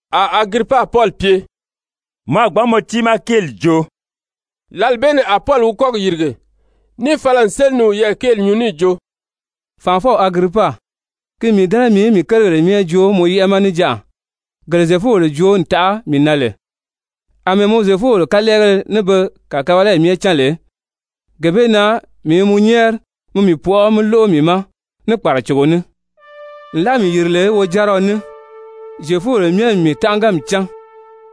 A Agiripa Pɔli pye: «Mɔ a gbǎn mɔ tiimaa kéeli joo.» Lǎli bee ni a Pɔli wi kɔ́gi yìrige níì fala n séli ni wiyɛɛ kéeli nyuu níì jo: «Fànʔafɔw Agiripa, ki n mii dɛ́nɛ mii í mii kérigèle myɛ joo mɔ yɛ́ʔɛ ma níjanʔa, gele Zyefubèle joo n taʔa mii na lè, àmɛɛ mɔ Zyefubèle kalɛɛgéle ní be kàkabalayi myɛ cán lè, gee bee na mii i mɔ nyɛ́ɛri mi mii pɔʔɔ mí lóʔo mii ma ní kpàracogo ní. Nlaa mii yìri lè wojáriɔ ní Zyefubèle myɛ n mii tánʔaganmi cán,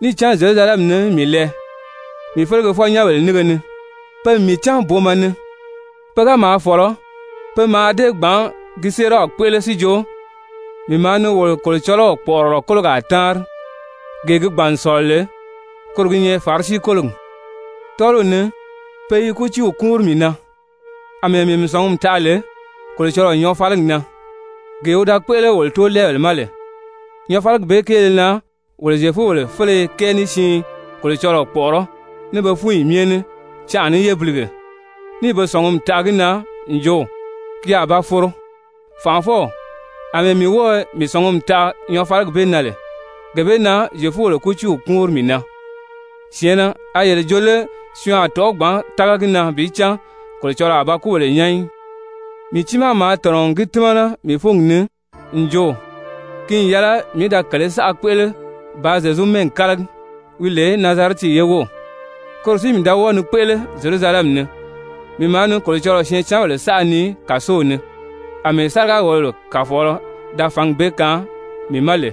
níì cán Zyerusalɛmi ni mii lɛɛ mii felegefɔ-nyɛ́nbèle nínge ni. Pe n mii cán booma ni. Pe ga maa fɔ̀lɔ, pe mǎà dée gbǎn gi séeraw kpéʔele si jo, mii maa ni wolo Kolocɔlɔw kpɔ̀ʔɔrɔlɔ kólogaa táanri, gee gi gbàn n sɔ̀lɔ lè, koro gi nyɛ Farisi-kólogi. Tɔ́ɔliw ni pe i kútiiw kúunri mii na, àmɛɛ mii mii sɔ̀ngumi taʔa lè Kolocɔlɔɔ nyɔɔfaligi na, gee wi da kpéʔele wolo tóolɛɛbèle ma lè. Nyɔɔfaligi bee kéele na wolo Zyefubèle féleye kɛɛ ní siin Kolocɔlɔɔ kpɔ̀ʔɔrɔ́ ní be fúnyi myɛ ní canʔa ní yébilige, níì be sɔ̀ngumi taʔa gi na n jo ki a ba foro. Fànʔafɔw, àmɛɛ mii wɔ́ɔ̀ mii sɔ̀ngumi taʔa nyɔɔfaligi bee na lè, gee bee na Zyefubèle kútiiw kúunri mii na. Syɛ̀ɛnnɛ! A yele jo lé syɔɔn a tɔ̀ʔɔ́ gbǎn tága gi na bi cán Kolocɔlɔɔ a ba kúbèle nyán í? Mii tiimaa maa tɔ̀nɔ ni gi tímana mii fúngi ni n jo, ki n yɛlɛ mii í da kèlē saʔa kpéʔele bàā Zyezu mɛ́ɛgi kálagi, wi lè Nazarɛti ye wów. Koro si mii da wɔ́ɔ ni kpéʔele Zyerusalɛmi ni, mii maa ni Kolocɔlɔɔ syɛɛncanbèle saʔa nii kàsow ni, àmɛɛ sáriga-wòlobèle kàfɔɔlɔ da fǎngi bee kaan mii ma lè,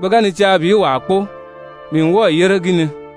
pe ga ni caa bi wàa kpóo, mii n wɔ́ɔ̀ yére gi ni.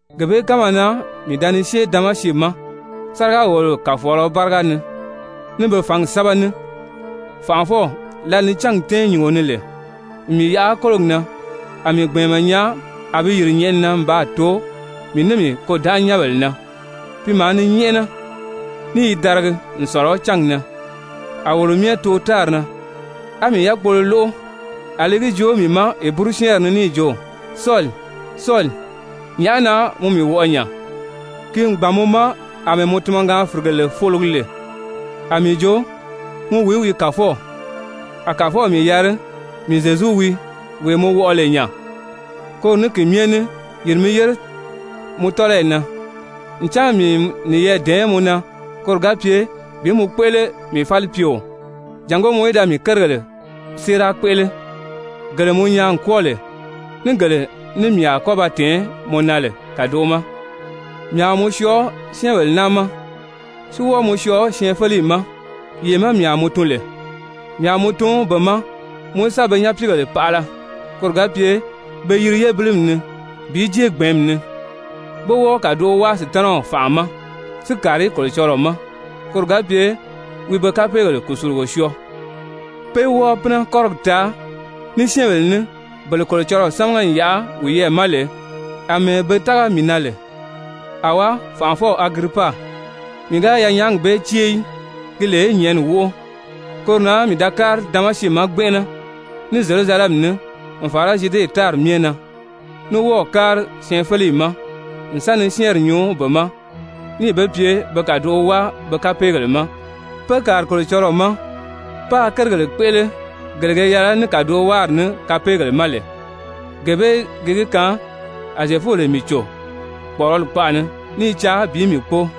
«Gee bee kánma na mii da ni syée Damasi ma sáriga-wòlobèle kàfɔɔlɔ báriga ni, ní be fǎngi sɛ́bɛ ní. Fànʔafɔw, lǎli ni cángi tɛ́ɛn nyùngo ni lè n mii yaʔa kólogi na, a mii gbɛ̀ɛnmɛ nyaa a bi yìri nyɛ̀ʔɛni na n baa too mii ní mii kôdanʔanyɛnbèle na, pi maa ni nyɛ́ʔɛnɛ ní i daragi n sɔ̀lɔ cángi na. A wolo myɛ too tári na, á mii yákpolo lóʔo a li gi joo mii ma Heburu-syɛ́ɛnri ni níì jo: ‹Sɔli, Sɔli, nyàʔá na mɔ mii wɔʔɔ nya? Ki n gbàn mɔ ma àmɛɛ mɔ tunmɔgaan-fìrigele fologi lè.› A mii jo: ‹Mɔ wìí wii, Kàfɔw?› A Kàfɔw mii yari: ‹Mii Zyezu wii, wee mɔ wɔʔɔ lè nya. Koro ní ki myɛ ní yìri mi yére mɔ tɔ́lɔyi na, ncan mii n niyɛɛ dɛ̀ɛn mɔ na koro ga pye bi mɔ kpéʔele mii falipyeo, jàngó mɔ í da mii kérigèle séera kpéʔele gele mɔ nyaa n kwɔ́ɔ lè, ní gele ní mii a kɔ́ ba tɛ̀ɛn mɔ na lè kàdoʔo ma. Mii a mɔ syɔɔ syɛ́ɛnbèle naa ma, si wɔ́ɔ mɔ syɔɔ syɛɛnfeleyi ma, yee má mii a mɔ tun lè. Mii a mɔ tun be ma mɔ í sa be nyapiigèle paʔala, koro ga pye pe yiri yébilimi ni bi jée gbɛ̀ɛ́nmi ni, pé wɔ́ɔ kàdoʔo wáa Sutanaw fànʔa ma si kàri Kolocɔlɔɔ ma, koro ga pye wi be kapeegèle kùsulugo syɔɔ, pé wɔ́ɔ pínɛ kɔ́rigi taa ní syɛ́ɛnbèle ní, bele Kolocɔlɔɔ sámaga n yaʔa wiyɛɛ ma lè, àmɛɛ be tága mii na lè.› «Awá, fànʔafɔw Agiripa, mii ga yanyaagi bee cée í, ki lè nyɛ̀ʔɛni wóʔo. Koro na mii da kári Damasi ma gbɛnʔɛnɛ ní Zyerusalɛmi ní, n fàra Zyude tári myɛ na, ní wɔ́ɔ̀ kári syɛɛnfeleyi ma n sa ni syɛ́ɛnri nyuu be ma níì be pye be kàdoʔo wáa be kapeegèle ma, pé kàri Kolocɔlɔɔ ma, páā kérigèle kpéʔele gele ge yɛlɛ ní kàdowaari ní kapeegèle ma lè. Gee bee gi gi kaan a Zyefubèle mii cò kpɔ̀ʔɔrɔli kpaʔa ni, ní i caa bi mii kpóo.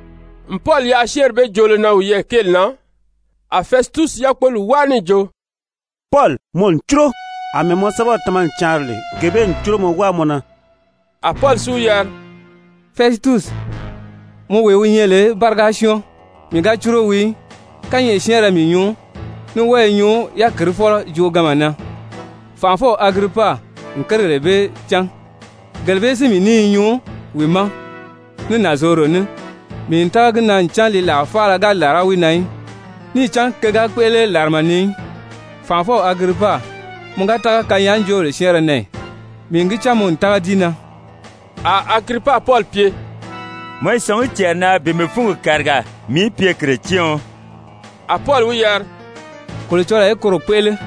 N Pɔli yaʔa syɛ́ɛnri bee joolo na wiyɛɛ kéeli na, a Fɛsitusi yákpoli wáa níì jo: «Pɔli, mɔ n cúro! Amɛɛ mɔ sɛ́bɛw tama n caanri lè, gee bee n cúromɔ wáa mɔ na.» A Pɔli si wi yari: «Fɛsitusi, mɔ wee wi nyɛ lè báriga syɔ́ɔn, mii ga cúro wii í. Kányɛʔɛ syɛ́ɛnrɛ mii nyuu, ní wɔ́ɔ i nyuu yákirifɔlɔ jooganma na. Fànʔafɔw Agiripa n kérigèle bee cán, gele bee si mii ní i nyuu wi ma ní nànzorodo ní, mii n tága gi na ncan li làa faala ga làra wi na í, níì cán ke ga kpéʔele làrama ni í. Fànʔafɔw Agiripa, mɔ ga tága kanyaajoobèle syɛ́ɛnrɛ na ì? Mii n gi cán mɔ n tága di na.» A Agiripa Pɔli pye: «Mɔ i sɔ̀ngí cɛɛri na bi mii fúngi kàriga mii í pye Kiretyɛɔn!» A Pɔli wi yari: «Kolocɔlɔɔ í koro kpéʔele,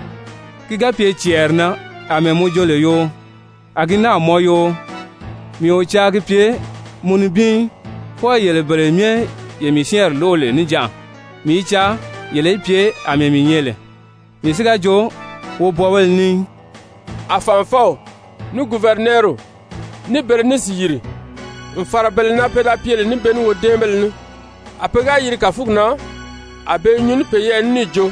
ki ga pye cɛɛri na àmɛɛ mɔ jo lè yoo, a gi náà mɔn yoo, mii o caa gi pye mɔ nibin í, fwɔɔ yele bele myɛ ye mii syɛ́ɛnri lóʔo lè níjanʔa, mii i caa yele í pye àmɛɛ mii nyɛ lè, mii si ga jo wobwɔɔbéle ní í.» A fànʔafɔw, ní guvɛrinɛɛriw, ní Berenisi yìri, n fàra bele na pe da pye lè ní be ní wodɛ́ɛnbéle ní. A pe ga yiri kàfugi na, a be i nyuu ní peyɛɛ ní níì jo: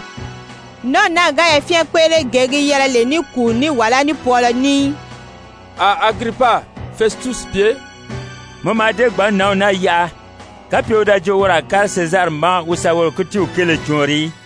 «Nǎnw naa ga yafyɛn kpéʔele gee gi yɛlɛ lè ní kùu ní wàlá ní pwɔɔlɔ ní í!» A Agiripa Fɛsitusi pye: «Mɔ mǎà dée gbǎn nǎnw naa yaʔa, kapye wi da jo woro a kári Sezari ma wi sa woro kútiiw kéele cɔɔnri í.»